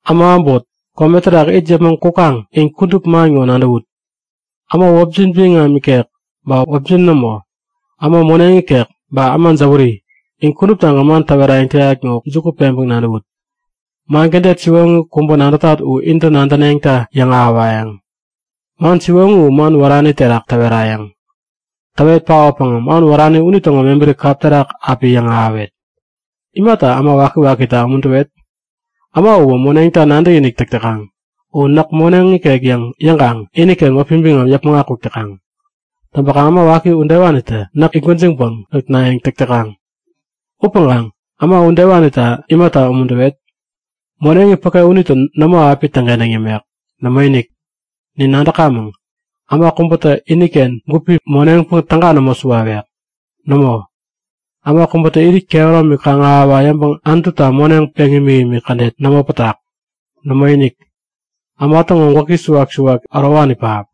Äma äbot, kome terak it yäpmäŋ kukaŋ in kudup man ŋo nadäwut. Äma wäpjin biŋam nikek ba wäpjin nämo, äma moneŋ ikek ba äma jäwäri, in kuduptagän man täwerayäŋ täyat ŋo juku peŋpäŋ nadäwut. Man kädet siwoŋi kubä nadätat u intä nadäneŋta yäŋahäwayäŋ. Man siwoŋi u man wärani terak täwerayäŋ. Täwet paotpäŋä man wärani unitäŋo mebäri kap terak api yäŋahäwet. Imata äma waki-wakita umuntäwet? Äma uwä moneŋta nadäkinik täk täkaŋ. U näk moneŋ ikek yäŋkaŋ iniken wäpi biŋam yäpmäŋ akuk täkaŋ. Täŋpäkaŋ äma waki udewanitä näk it gwäjiŋpäŋ nutnayäŋ täk täkaŋ. Upäŋkaŋ, äma udewanita imata umuntäwet? Moneŋi päke unitä nämo api täŋkentäŋ yämek. Nämoinik! Nin nadäkamäŋ; Äma kubätä iniken gupi moneŋpäŋ täga nämo suwawek. Nämo, äma kubätä irit kehäromi kaŋ-ahäwa yäŋpäŋ Anututa moneŋ peŋ imikimik kädet nämo pätak. Nämoinik, äma täŋo gwäki suwak-suwak ärowani pähap.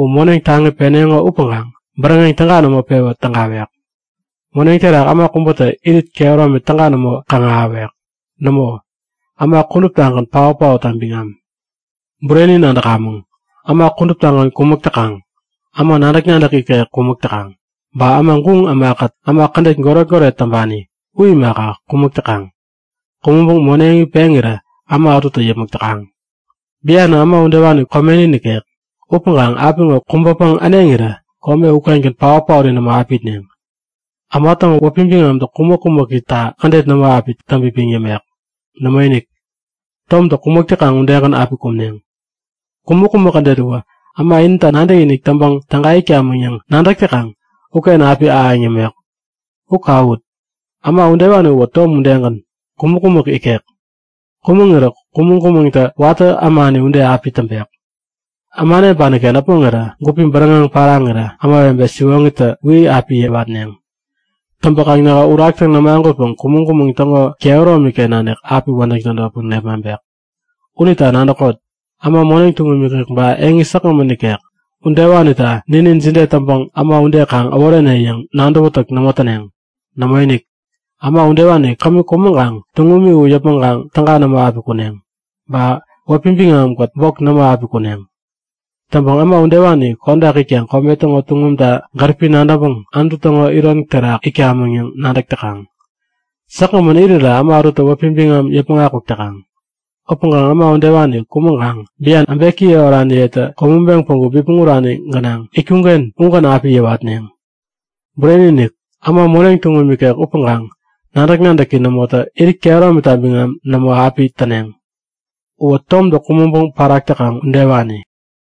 U moneŋ taŋi peneŋo upäŋkaŋ bäräŋeŋ täga nämo pewä tägawek. Moneŋ terak äma kubätä irit kehäromi täga nämo kaŋ-ahäwek. Nämo, äma kuduptagän paot-paotta biŋam. Bureni nadäkamäŋ. Äma kuduptagän kumäk täkaŋ. Äma nadäk-nadäk ikek kumäk täkaŋ. Ba guŋ ämakät äma kädet goret-goret täŋpani u imaka, kumäk täkaŋ. Kumäŋpäŋ moneŋi peŋirä äma ätutä yäpmäk täkaŋ. Bianä, äma udewani komeni nikek. Upäŋkaŋ apiŋo kubäpäŋ äneŋirä kome ukengän paot-paori nämo api itneŋ. Äma täŋo wäpi biŋamtä kumäk-kumäkita kädet nämo api täŋpipiŋ yämek. Nämoinik! Tomtä kumäk täkaŋ udegän api kumneŋ. Kumäk-kumäk kädet uwä, äma inita nadäkinik täŋpäŋ täga itkamäŋ yäŋ nadäk täkaŋ uken api ahäŋ yämek. U kawut! Äma udewani uwä tom udegän, kumäk-kumäk ikek. Kumäŋirä kumäŋ-kumäŋtä watä ämani ude api täŋpek. Äma äneŋpaniken äpmoŋirä gupi bäräŋeŋ paraŋirä ämawebe siwoŋitä Wi! api yäwatneŋ. Täŋpäkaŋ nähä Uraktä nämagutpäŋ kumäŋ-kumäŋ täŋo kehäromiken nanik api wädäŋ tädotpäŋ nepmaŋpek. Unita nadäkot! Äma moneŋ tuŋum ikek ba eŋi säkgämän nikek, udewanita ninin jide täŋpäŋ äma ude kaŋ äworene yäŋ nadäwätäk nämo täneŋ. Nämoinik! Äma udewani kämi kumäŋkaŋ tuŋumi u yäpmäŋkaŋ täga nämo api kuneŋ. Ba wäpi biŋamikät bok nämo api kuneŋ. Täŋpäŋ äma udewani kodak itkaŋ kome täŋo tuŋumta gäripi nadäŋpäŋ Anutu täŋo iron terak itkamäŋ yäŋ nadäk täkaŋ. Säkgämän irirä äma ätutä wäpi biŋam yäpmäŋ akuk täkaŋ. Upäŋkaŋ äma udewani kumäŋkaŋ, bian äbekiye oraniyetä kumäŋpeŋ päŋku bipmäŋ urani gänaŋ itkuŋken ugän api yäwatneŋ. Bureni-inik! Äma moneŋ tuŋum ikek upäkaŋ nadäk-nadäki nämotä irit kehäromita biŋam nämo api täneŋ. Uwä tomtä kumäŋpäŋ parak täkaŋ udewani.